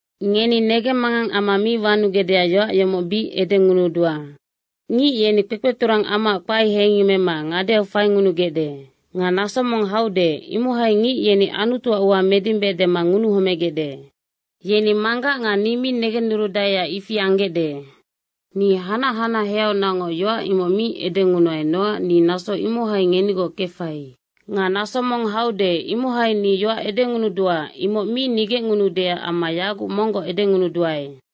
Ngeni negemmangang amma mi wanugecdeac yoac yomoc bic edengunudua. Ngic yeni kpekpeturang amaac kpae heingemmema ngadeau faingunugecde. Nga naso mong haude, imohai ngic yeni Anutuac ua medimbe dema ngunuhomegecde. Yeni Manggac nga ni mi negennurudaeac ifi anggecde. Ni hanac hanaheaunacngoc yoac imoc mi edengunuai nocac ni naso imohai ngenigoc kefai. Nga naso mong haude, imohai ni yoac edengunudua, imoc mi nigecngunuudeac amma yaguc monggoc edengunuduae.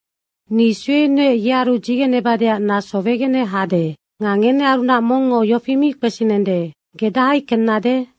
“Ni suenuec, yearu dzigenebadeac naso wegene hade. Nga ngenearunac mongngo yofi mi kpesinende, ‘Ge dahai kennade?’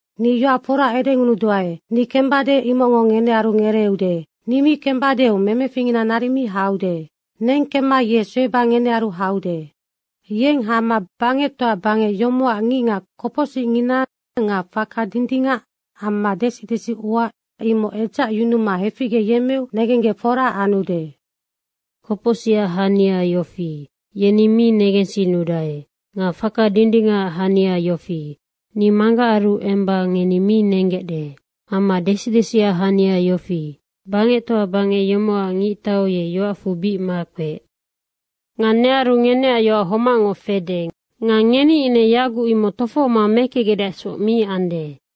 Ni yoac fora edengunuduae, ni kembade, imocngo ngenearu ngereeude. Ni mi kembadeu memeficngina naric mi haude. Neng kemma ye sueba ngenearu haude. Yeng hama bangectoa bangec yomocac ngicngac kopocsicngina nga faka dindingac amma desi desiua imoc edzacyunuma heficgeyemmeu negenggec fora anude. Kopocsicac hania yofi, yeni ni mi negensinnudae. Nga faka dindingacac hania yofi, ni Manggacaru emba ngeni mi nenggecde. Amma desi desiac hania yofi, bangectoa bangec yomocac ngictau ye yoacfu bic makpeec. Nga nearu ngeneac yoac homacngoc fede. Nga ngeni ine yaguc imoc tofohoma mekecgecdeacsoc mi ande.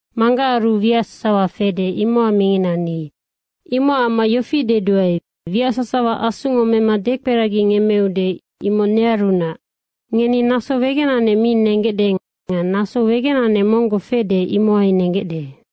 Manggacaru wiac sasawa fede, imocac mingina ni. Imocac amma yofi deduae, wiac sasawa Asungo mema dekperagingemmeude, imoc nearunac. Ngeni naso wegenanec mi nenggecde nga naso wegenanec monggoc fede, imohai nenggecde.”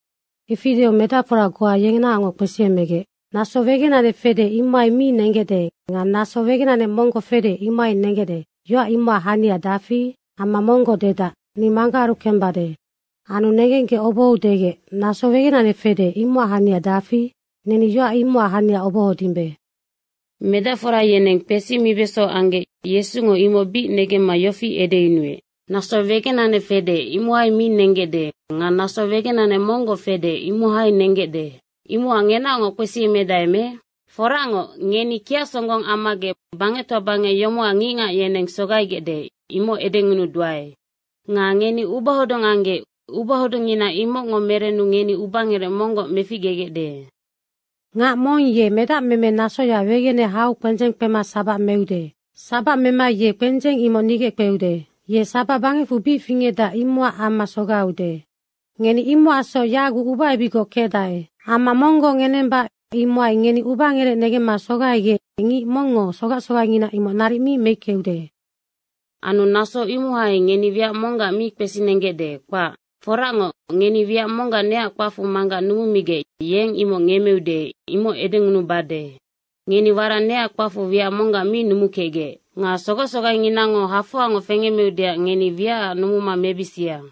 Ifi deu medacfora goa yenaocngoc kpesiemegec, “‘Naso wegenanec fede, imohai mi nenggecde nga naso wegenanec monggoc fede, imohai nenggecde.’ yoac imocac hania dafi? Amma monggoc dedac, ‘Ni Manggacaru kembade.’” Anu negenggec obohou degec, “Naso wegenanec fede, imocac hania dafi? Neni yoac imocac hania obohodimbe.” Medacfora yeneng kpesimibeso anggec Yesungo imoc bic negemma yofi edeyunuec, “Naso wegenanec fede, imohai mi nenggecde nga naso wegenanec monggoc fede, imohai nenggecde. Imocac ngenaocngoc kpesiemedae me? Foracngoc, ngeni kiac songgong ammagec bangectoa bangec yomocac ngicngac yeneng sogaigecde, imoc edengunuduae. Nga ngeni ubahodung anggec ubahodungngina imocngo merennu ngeni ubangerec monggoc meficgegecde. Ngac mong ye medacmeme nasoya wegene hau kpendzeng kpema sabac meude. Sabac mema ye kpendzeng imoc nigeckpeude. Ye sabac bangecfu bic fingecdac, imocac amma sogaiude. Ngeni imocacsoc yaguc ubaebicgoc kecdae. Amma monggoc ngenemba imohai ngeni ubangerec negemma sogaigec ngic mongngo sogac sogaingina imoc naric mi meickeude. Anu naso imohai ngeni wiac monggac mi kpesinenggecde, kpac. Foracngoc, ngeni wiac monggac neac kpacfu Manggac numumigec yeng imoc ngemmeude, imoc edengunubade. Ngeni warac neac kpacfu wiac monggac mi numukecgec. Nga sogac sogainginango hafoangoc fengemmeudeac ngeni wiacac numuma mebisia.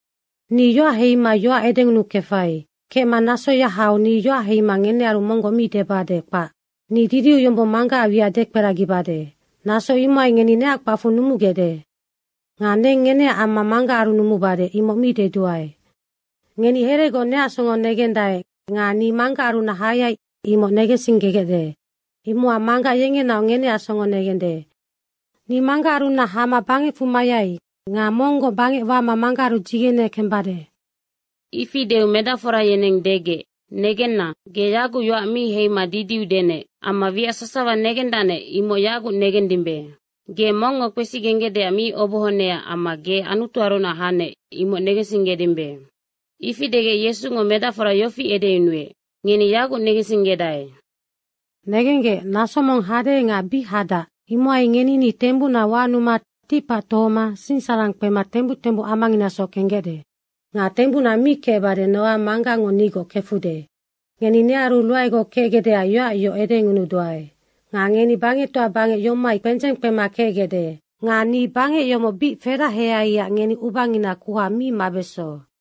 Ni yoac heima yoac edengunukefai. Kecma nasoya hau ni yoac heima ngenearu monggoc mi debade, kpac. Ni didiu yombong Manggacac wiac dekperagibade. Naso imohai ngeni neac kpacfu numugecde. Nga neng ngeneac amma Manggacaru numubade, imoc mi deduae. Ngeni heregoc neac songo negendae nga ni Manggacarunac hayai, imoc negensinggegecde. Imocac Manggac yengenaoc ngeneac songo negende. Ni Manggacarunac hama bangecfu mayai nga monggoc bangec wama Manggacaru dzigene kembade.” Ifi deu medacfora yeneng degec, “Negenna, ge yaguc yoac mi heima didiu denec.” Amma wiac sasawa negendacnec, imoc yaguc negendimbe. Ge mongngo kpesigenggecdeac mi obohonecac amma ge Anutuarunac hanec, imoc negensinggedimbe. Ifi degec Yesungo medacfora yofi edeyunuec, “Ngeni yaguc negensinggedae. Negenggec, naso mong hade nga bic hadac imohai ngeni ni tembucna wanuma ticpac tohoma sinsararang kpema tembuc tembuc amanginasoc kenggecde. Nga tembucna mi kecbade, nocac Manggacngo nigoc kefude. Ngeni nearu ruaegoc kecgecdeac yoac yoc edengunuduae. Nga ngeni bangectoa bangec yomohai kpendzeng kpema kecgecde. Nga ni bangec yomoc bic feraheaiac ngeni ubangina kuha mi mabeso.”